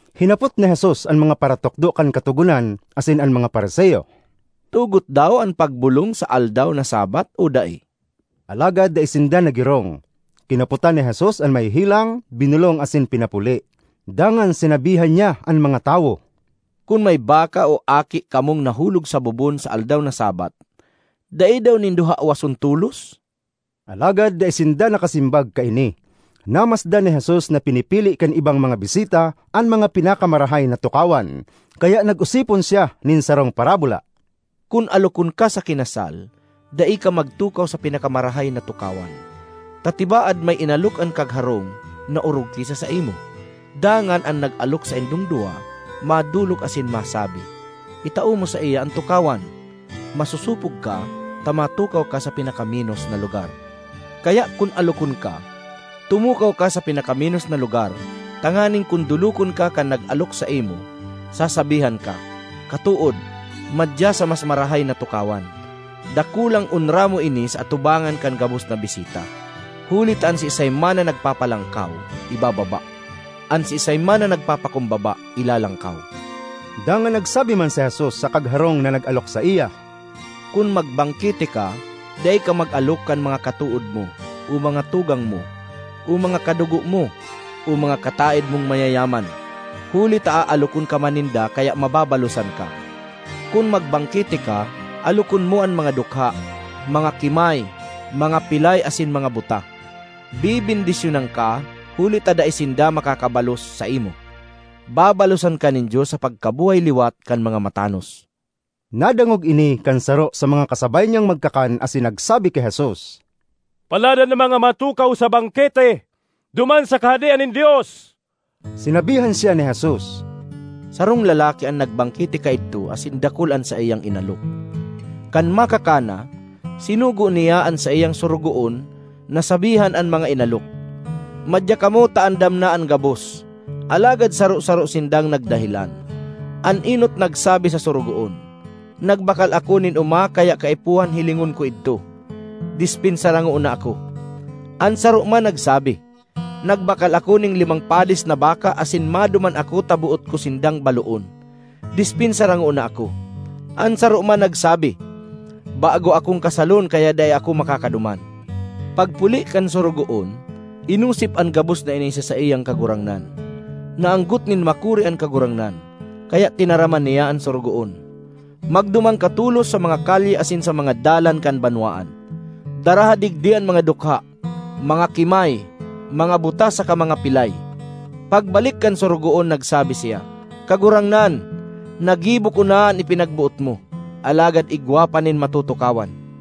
Hinapot ni Jesus an mga paratukdo kan Katogonan asin an mga Fariseo, “Tugot daw an pagbolong sa aldaw na Sabbath o dai?” Alagad dai sinda naggirong. Kinapotan ni Jesus an may helang, binolong asin pinapuli. Dangan sinabihan niya an mga tawo, “Kun may baka o aki kamong nahulog sa bobon sa aldaw na Sabbath, dai daw nindo hawason tolos?” Alagad dai sinda nakasimbag kaini. Namasdan ni Jesus na pinipili kan ibang mga bisita an mga pinakamarahay na tukawan, kaya nag-osipon siya nin sarong parabola, ”Kun alokon ka sa kinasal, dai ka magtukaw sa pinakamarahay na tukawan, ta tibaad may inalok an kagharong na orog ki sa saimo; dangan an nag-alok saindong duwa madolok asin masabi, ‘Itao mo saiya an tukawan.’ Masosopog ka ta matukaw ka sa pinakamenos na lugar. Kaya kun alokon ka, tumukaw ka sa pinakamenos na lugar tanganing kun dolokon ka kan nag-alok saimo, sasabihan ka, ‘Katood, madya sa mas marahay na tukawan.’ Dakulang onra mo ini sa atubangan kan gabos na bisita. Huli ta an siisay man na nagpapalangkaw, ibababa; an siisay man na nagpapakumbaba, ilalangkaw.” Dangan nagsabi man si Jesus sa kagharong na nag-alok saiya, “Kun magbangkete ka, dai ka mag-alok kan mga katood mo, o mga tugang mo, o mga kadugo mo, o mga kataed mong mayayaman; huli ta aalokon ka man ninda kaya mababalosan ka. Kun magbangkete ka, alokon mo an mga dukha, mga kimay, mga pilay asin mga buta. Bebendisyonan ka, huli ta dai sinda makakabalos saimo. Babalosan ka nin Dios sa pagkabuhay liwat kan mga matanos.” Nadangog ini kan saro sa mga kasabay niyang magkakan asin nagsabi ki Jesus, “Paladan an mga matukaw sa bangkete duman sa Kahadean nin Dios!” Sinabihan siya ni Jesus, “Sarong lalaki an nagbangkete kaidto asin dakul an saiyang inalok. Kan makakan na, sinugo niya an saiyang sorogoon na sabihan an mga inalok, ‘Madya kamo ta andam na an gabos!’ Alagad saro-saro sindang nagdahelan. An enot nagsabi sa sorogoon, ‘Nagbakal ako nin oma kaya kaipuhan hilingon ko idto; despensara ngona ako.’ An saro man nagsabi, ‘Nagbakal ako nin limang padis na baka asin maduman ako ta boot ko sindang baloon; despensara ngona ako.’ An saro man nagsabi, ‘Bago akong kasalon kaya dai ako makakaduman.’ Pagpuli kan sorogoon, inosip an gabos na ini sa saiyang kagurangnan. Naanggot nin makuri an kagurangnan, kaya tinaraman niya an sorogoon, ‘Magduman ka tolos sa mga kalye asin sa mga dalan kan banwaan. Daraha digdi an mga dukha, mga kimay, mga buta saka mga pilay!’ Pagbalik kan sorogoon nagsabi siya, ‘Kagurangnan, nagibo ko na an ipinagboot mo, alagad igwa pa nin matutukawan.’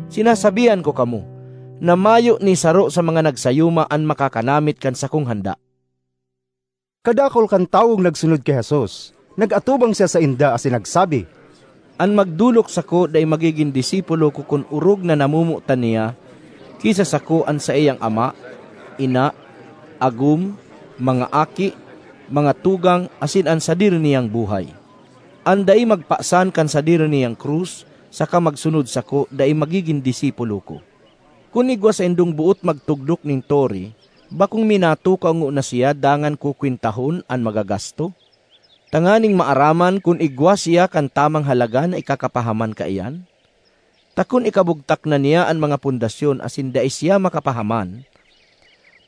Sinasabihan ko kamo na mayo ni saro sa mga nagsayuma an makakanamit kan sakong handa!’” Kadakul kan tawong nagsunod ki Jesus. Nag-atubang siya sainda asin nagsabi, ”An magdolok sako dai magigin disipulo ko kun orog na namomotan niya ki sa sako an saiyang ama, ina, agom, mga aki, mga tugang, asin an sadiri niyang buhay. An dai magpasan kan sadiri niyang krus saka magsunod sako dai magigin disipulo ko. Kun igwa saindong boot magtugdok nin tore, bakong minatukaw ngona siya dangan kukwentahon an magagasto, tanganing maaraman kun igwa siya kan tamang halaga na ikakapahaman kaiyan? Ta kun ikabugtak na niya an mga pundasyon asin dai siya makapahaman,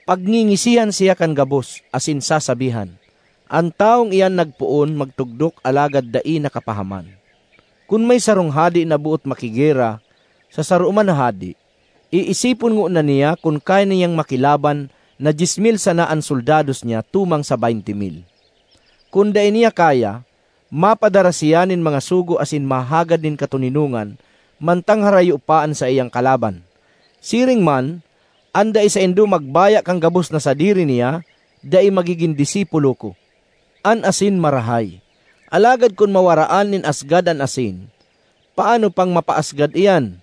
pagngingisihan siya kan gabos, asin sasabihan, ‘An tawong iyan nagpoon magtugdok alagad dai nakapahaman!’ Kun may sarong hade na boot makigera sa saro man na hade, iisipon ngona niya kun kaya niyang makilaban na dyes mil sana an soldados niya tumang sa beynte mil. Kun dai niya kaya, mapadara siya nin mga sugo asin mahagad nin katoninongan mantang harayo pa an saiyang kalaban. Siring man, an dai saindo magbaya kan gabos na sadiri niya, dai magigin disipulo ko. ”An asin marahay, alagad kun mawaraan nin asgad an asin, paano pang mapaasgad iyan?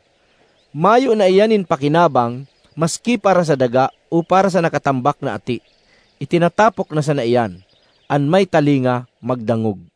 Mayo na iyan nin pakinabang maski para sa daga o para sa nakatambak na ati; itinatapok na sana iyan. An may talinga magdangog!”